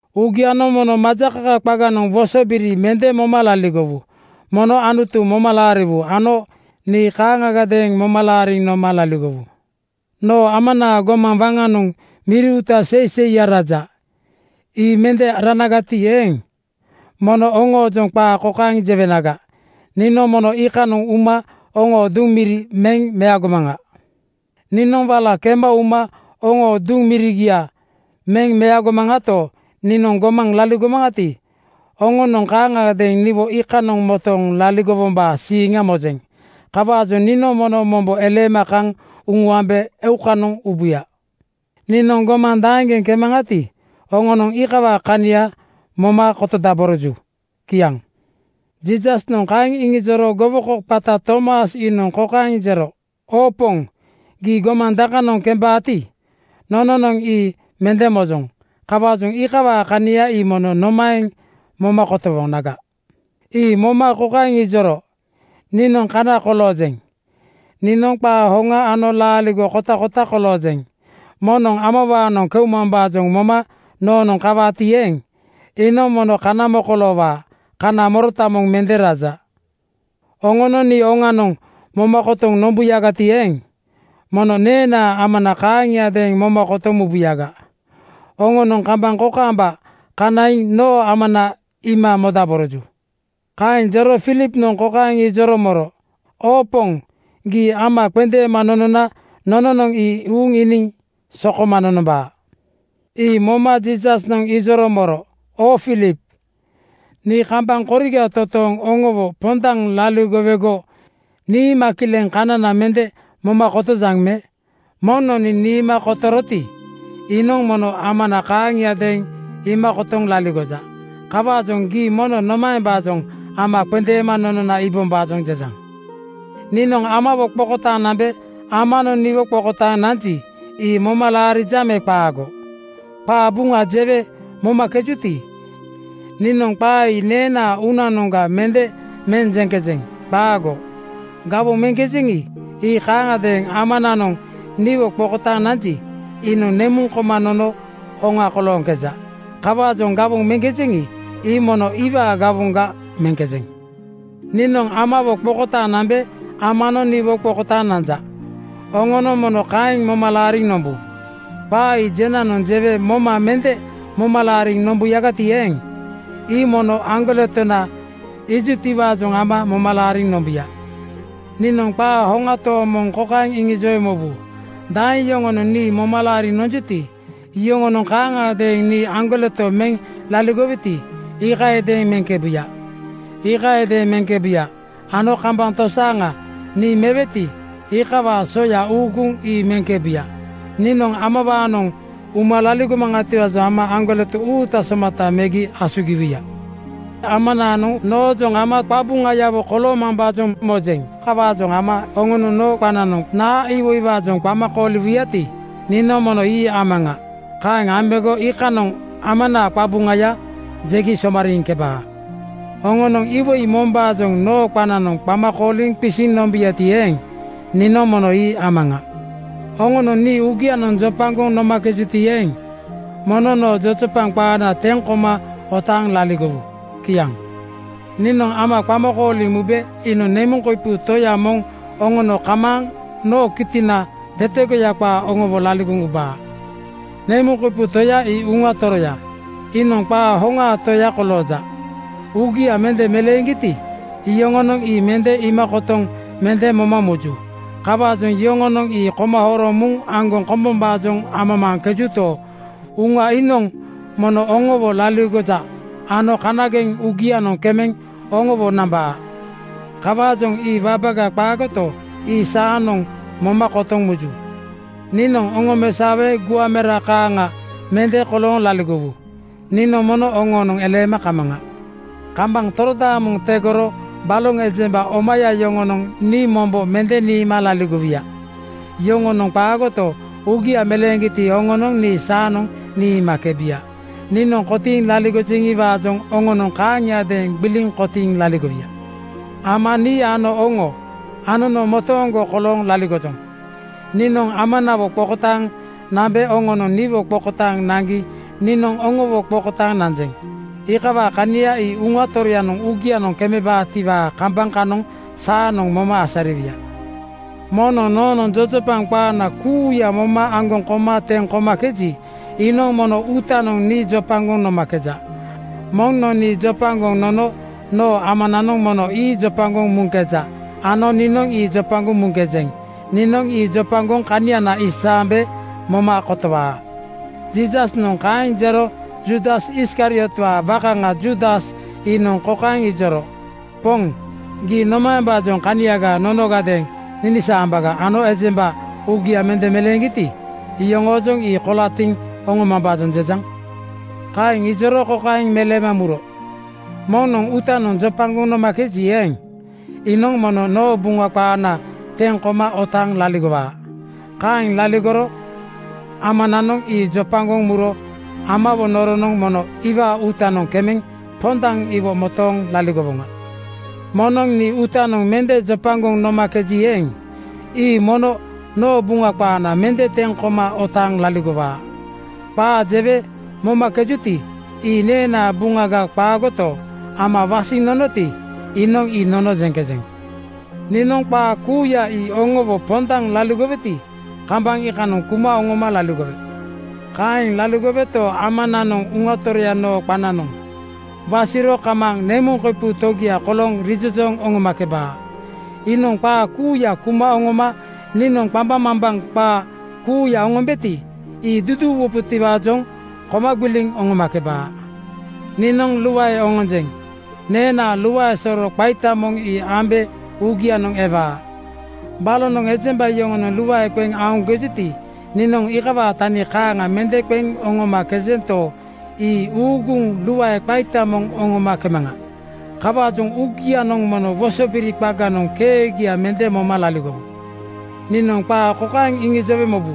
“Uugianoŋ mono majakaka qaganoŋ wosobiri mende moma laligowu. Mono Anutu moma laariwu ano nii kaaŋgadeeŋ moma laariŋ noma laligowu. Noo Amanaa gomaŋ waŋanoŋ miri uuta seiseiya raja. Ii mende ranagati eeŋ, mono oŋoojoŋ qaa kokaeŋ jewenaga: Niinoŋ mono iikanoŋ uma oŋoo duŋ miri meŋ meagomaŋa. “Niinoŋ wala kema uma oŋoo duŋ mirigia meŋ meagomaŋato, niinoŋ gomaŋ laligomaŋati, oŋonoŋ kaaŋagadeeŋ niwo iikanoŋ motooŋ laligowombaa siiŋa mojeŋ. Kawaajoŋ niinoŋ mono mombo eleema kaŋ uŋuambe eukanoŋ ubuya. Niinoŋ gomaŋ daeŋgeŋ kemaŋati, oŋonoŋ iikawaa kania moma kotodaboroju.” Kiaŋ. Jiisasnoŋ kaeŋ iŋijoro gowoko qata Tomas iinoŋ kokaeŋ jero, “Oo Poŋ, gii gomaŋ dakanoŋ kembaati, nononoŋ ii mende mojoŋ. Kawaajoŋ iikawaa kania ii mono nomaeŋ moma kotowonaga?” Ii moma kokaeŋ ijoro, “Niinoŋ Kana koloojeŋ. Niinoŋ Qaa hoŋa ano Laaligo kotakota koloojeŋ. Moŋnoŋ Amawaanoŋ keumambaajoŋ moma noonoŋ kawaati eeŋ, iinoŋ mono kana mokoloowaa. Kana morota moŋ mende raja. Oŋonoŋ nii oŋanoŋ moma kotoŋ nombuyagati eeŋ, mono neenaa Amana kaaŋiadeeŋ moma kotoŋ mubuyaga. Oŋonoŋ kambaŋ kokaamba kanaiŋ noo Amana iima modaboroju.” Kaeŋ jero Filipnoŋ kokaeŋ ijoro moro, “Oo Poŋ, gii Ama qendeema nonona nononoŋ ii uuŋ iiniŋ sokoma nonombaa.” Ii moma Jiisasnoŋ ijoro moro, “Oo Filip, nii kambaŋ koriga totooŋ oŋowo pondaŋ laligowego niima kileŋ kanana mende moma kotojaŋ me? Moŋnoŋ nii niima kotoroti, iinoŋ mono Amana kaaŋagadeeŋ iima kotoŋ laligoja. Kawaajoŋ gii mono nomaembaajoŋ Ama qendeema nonona iibombaajoŋ jejaŋ? “Niinoŋ Amawo qokotaaŋ nambe Amanoŋ niwo qokotaaŋ nanji, ii moma laarijaŋ me qaago? Qaa Buŋa jewe momakejuti, niinoŋ qaa ii neenaa uunanoŋga mende meŋ jeŋkejeŋ. Qaago! Gawoŋ meŋkejeŋi, ii kaaŋagadeeŋ Amananoŋ niwo qokotaaŋ nanji, iinoŋ nemuŋ koma nono hoŋa kolooŋkeja. Kawaajoŋ gawoŋ meŋkejeŋi, ii mono iwaa gawoŋga meŋkejeŋ. “Niinoŋ Amawo qokotaaŋ nambe Amanoŋ niwo qokotaaŋ nanja. Oŋonoŋ mono kaeŋ moma laariŋ nombu. Qaa ii jenanoŋ jewe moma mende moma laariŋ nombuyagati eeŋ, ii mono aŋgoletona iijutiwaajoŋ ama moma laariŋ nombuya. Niinoŋ qaa hoŋa tooŋ moŋ kokaeŋ iŋijowe mobu: Daeŋ yoŋonoŋ nii moma laariŋ nonjuti, yoŋonoŋ kaaŋagadeeŋ nii aŋgoleto meŋ laligoweti, iikayadeeŋ meŋkebuya. Iikaaŋadeeŋ meŋkebuya ano kambaŋ tosaaŋanoŋ niinoŋ meweti, iikawaa soya uuguŋ ii meŋkebuya. Niinoŋ Amawaanoŋ uma laligomaŋatiwaajoŋ ama aŋgoleto uuta somata megi asugiwuya. “Amananoŋ noojoŋ ama qabuŋayawo koloowaatiwaajoŋ mojeŋ. Kawaajoŋ ama oŋonoŋ noo qananoŋ naa iwoiwaajoŋ qama kooliwuyati, niinoŋ mono ii amaŋa. Kaeŋ ambego iikanoŋ Amanaa qabuŋaya jegi somariiŋkebaa. Oŋonoŋ iwoi mombaajoŋ noo qananoŋ qama kooliŋ qisiŋ nombuyati eeŋ, niinoŋ mono ii amaŋa. Oŋonoŋ nii uugianoŋ jopagoŋ nomakejuti eeŋ, mono noo jojopaŋ qaana teŋ koma otaaŋ laligowu.” Kiaŋ. “Niinoŋ Ama qama kooliŋ mube iinoŋ nemuŋ koipu Toya moŋ oŋono kamaaŋ noo kitina tetegoya qaa oŋowo laligoŋ ubaa. Nemuŋ koipu Toya ii Uŋa Toroya. Iinoŋ qaa hoŋaa Toya kolooja. Uugia mende meleeŋgiti, iyoŋonoŋ ii mende iima kotoŋ mende moma muju. Kawaajoŋ yoŋonoŋ ii koma horoŋ muŋ aŋgoŋ kombombaajoŋ amamaaŋkejuto, Uŋa iinoŋ mono oŋowo laligoja ano kanageŋ uugianoŋ kemeŋ oŋowo nambaa. Kawaajoŋ ii wabaga qaagoto, ii saanoŋ moma kotoŋ muju. “Niinoŋ oŋomesaowe guaŋ mera kaaŋa mende kolooŋ laligowu. Nii mono oŋoonoŋ eleema kamaŋa. Kambaŋ torodaamoŋ tegorogo baloŋ ejemba omaya yoŋonoŋ nii mombo mende niima laligowuya. Yoŋonoŋ qaagoto, uugia meleeŋgiti, oŋonoŋ nii saanoŋ niimakebuya. Niinoŋ kotiiŋ laligojeŋiwaajoŋ oŋonoŋ kaaŋiadeeŋ gbiliŋ kotiiŋ laligowuya. Ama, nii ano oŋo, anono motooŋgo kolooŋ laligojoŋ. Niinoŋ Amanawo qokotaaŋ nambe oŋonoŋ niwo qokotaaŋ naŋgi niinoŋ oŋowo qokotaaŋ nanjeŋ. Iikawaa kania ii Uŋa Toroyanoŋ uugianoŋ kemebaatiwaa kambaŋ kanoŋ saanoŋ moma asariwuya. “Moŋnoŋ noonoŋ jojopaŋ qaana kuuya moma aŋgoŋ koma teŋ komakeji, iinoŋ mono uutanoŋ nii jopagoŋ nomakeja. Moŋnoŋ nii jopagoŋ nono noo Amananoŋ mono ii jopagoŋ muŋkeja ano niinoŋ ii jopagoŋ muŋkejeŋ. Niinoŋ ii jopagoŋ kaniana isaambe moma kotowaa.” Jiisasnoŋ kaeŋ jero Juudas Iskariotwaa wakaŋa Juudas iinoŋ kokaeŋ ijoro, “Poŋ, gii nomaembaajoŋ kaniaga nonogadeeŋ ninisaambaga ano ejemba uugia mende meleeŋgiti, yoŋoojoŋ ii kolatiŋ oŋomambaajoŋ jejaŋ?” Kaeŋ ijoro kokaeŋ meleema muro, “Moŋnoŋ uutanoŋ jopagoŋ nomakeji eeŋ, iinoŋ mono noo Buŋa qaana teŋ koma otaaŋ laligowaa. Kaeŋ laligoro Amananoŋ ii jopagoŋ muro Amawo noronoŋ mono iwaa uutanoŋ kemeŋ pondaŋ iwo motooŋ laligowoŋa. Moŋnoŋ nii uutanoŋ mende jopagoŋ nomakeji eeŋ, ii mono noo Buŋa qaana mende teŋ koma otaaŋ laligowaa. Qaa jewe momakejuti, ii neenaa Buŋaga qaagoto, Ama wasiŋ nonoti, iinoŋ ii nono jeŋkejeŋ. “Niinoŋ qaa kuuya ii oŋowo pondaŋ laligoweti, kambaŋ iikanoŋ kuma oŋoma laligowe. Kaeŋ laligoweto, Amanoŋ Uŋa Toroya noo qananoŋ wasiro kamaaŋ nemuŋ koipu Togia kolooŋ rijojooŋ oŋomakebaa. Iinoŋ qaa kuuya kuma oŋoma niinoŋ qambaŋmambaŋ qaa kuuya oŋombeti, ii duduuwubotiwaajoŋ koma gbiliŋ oŋomakebaa. “Niinoŋ luae oŋonjeŋ. Neenaa luae soro qaita moŋ ii ambe uugianoŋ ewaa. Balonoŋ ejemba yoŋonoŋ luae qeŋ aoŋkejuti, niinoŋ iikawaa tani kaaŋa mende qeŋ oŋomakejento, ii uuguŋ luae qaita moŋ oŋomakemaŋa. Kawaajoŋ uugianoŋ mono wosobiri qaganoŋ keegia mende moma laligowu. “Niinoŋ qaa kokaeŋ iŋijowe mobu,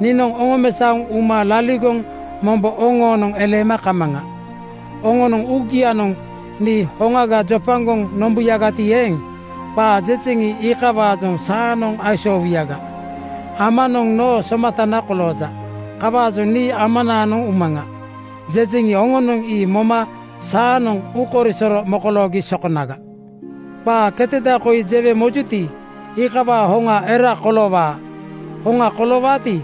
‘Niinoŋ oŋomesaoŋ uma laligoŋ mombo oŋoonoŋ eleema kamaŋa.’ Oŋonoŋ uugianoŋ nii hoŋaga jopagoŋ nombuyagati eeŋ, qaa jejeŋi, iikawaajoŋ saanoŋ aisoowuyaga. Amanoŋ noo somatana kolooja. Kawaajoŋ nii ‘Amanaanoŋ umaŋa,’ jejeŋi, oŋonoŋ ii moma saanoŋ uukoisoro mokoloogi sokonaga. Qaa keteda koi jewe mojuti, iikawaa hoŋa era koloowaa. Hoŋa koloowaati,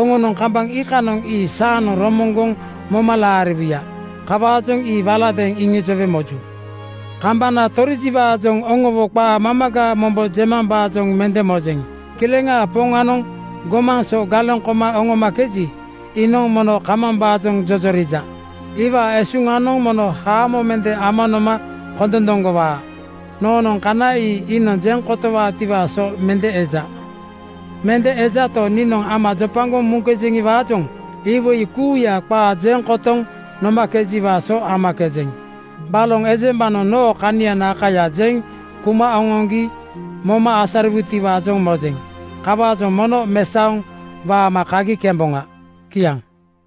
oŋonoŋ kambaŋ iikanoŋ ii saanoŋ romoŋgoŋ moma laariwuya. Kawaajoŋ ii waladeeŋ iŋijowe moju. “Kambana torijiwaajoŋ oŋowo qaa mamaga mombo jemambaajoŋ mende mojeŋ. Kileŋaa Poŋanoŋ gomaŋ so galeŋ koma oŋomakeji, iinoŋ mono kamambaajoŋ jojorija. Iwaa esuŋanoŋ mono haamo mende ama noma kondondoŋgowaa. Noonoŋ kana ii iinoŋ jeŋ kotowaatiwaa so mende eja. Mende ejato, niinoŋ Ama jopagoŋ muŋkejeŋiwaajoŋ iwoi kuuya qaa jeŋ kotoŋ nomakejiwaa so amakejeŋ. Baloŋ ejembanoŋ noo kaniana kaya jeŋ kuma oŋoŋgi moma asariwutiwaajoŋ mojeŋ. Kawaajoŋ mono mesaoŋ waama kagi kemboŋa.” Kiaŋ.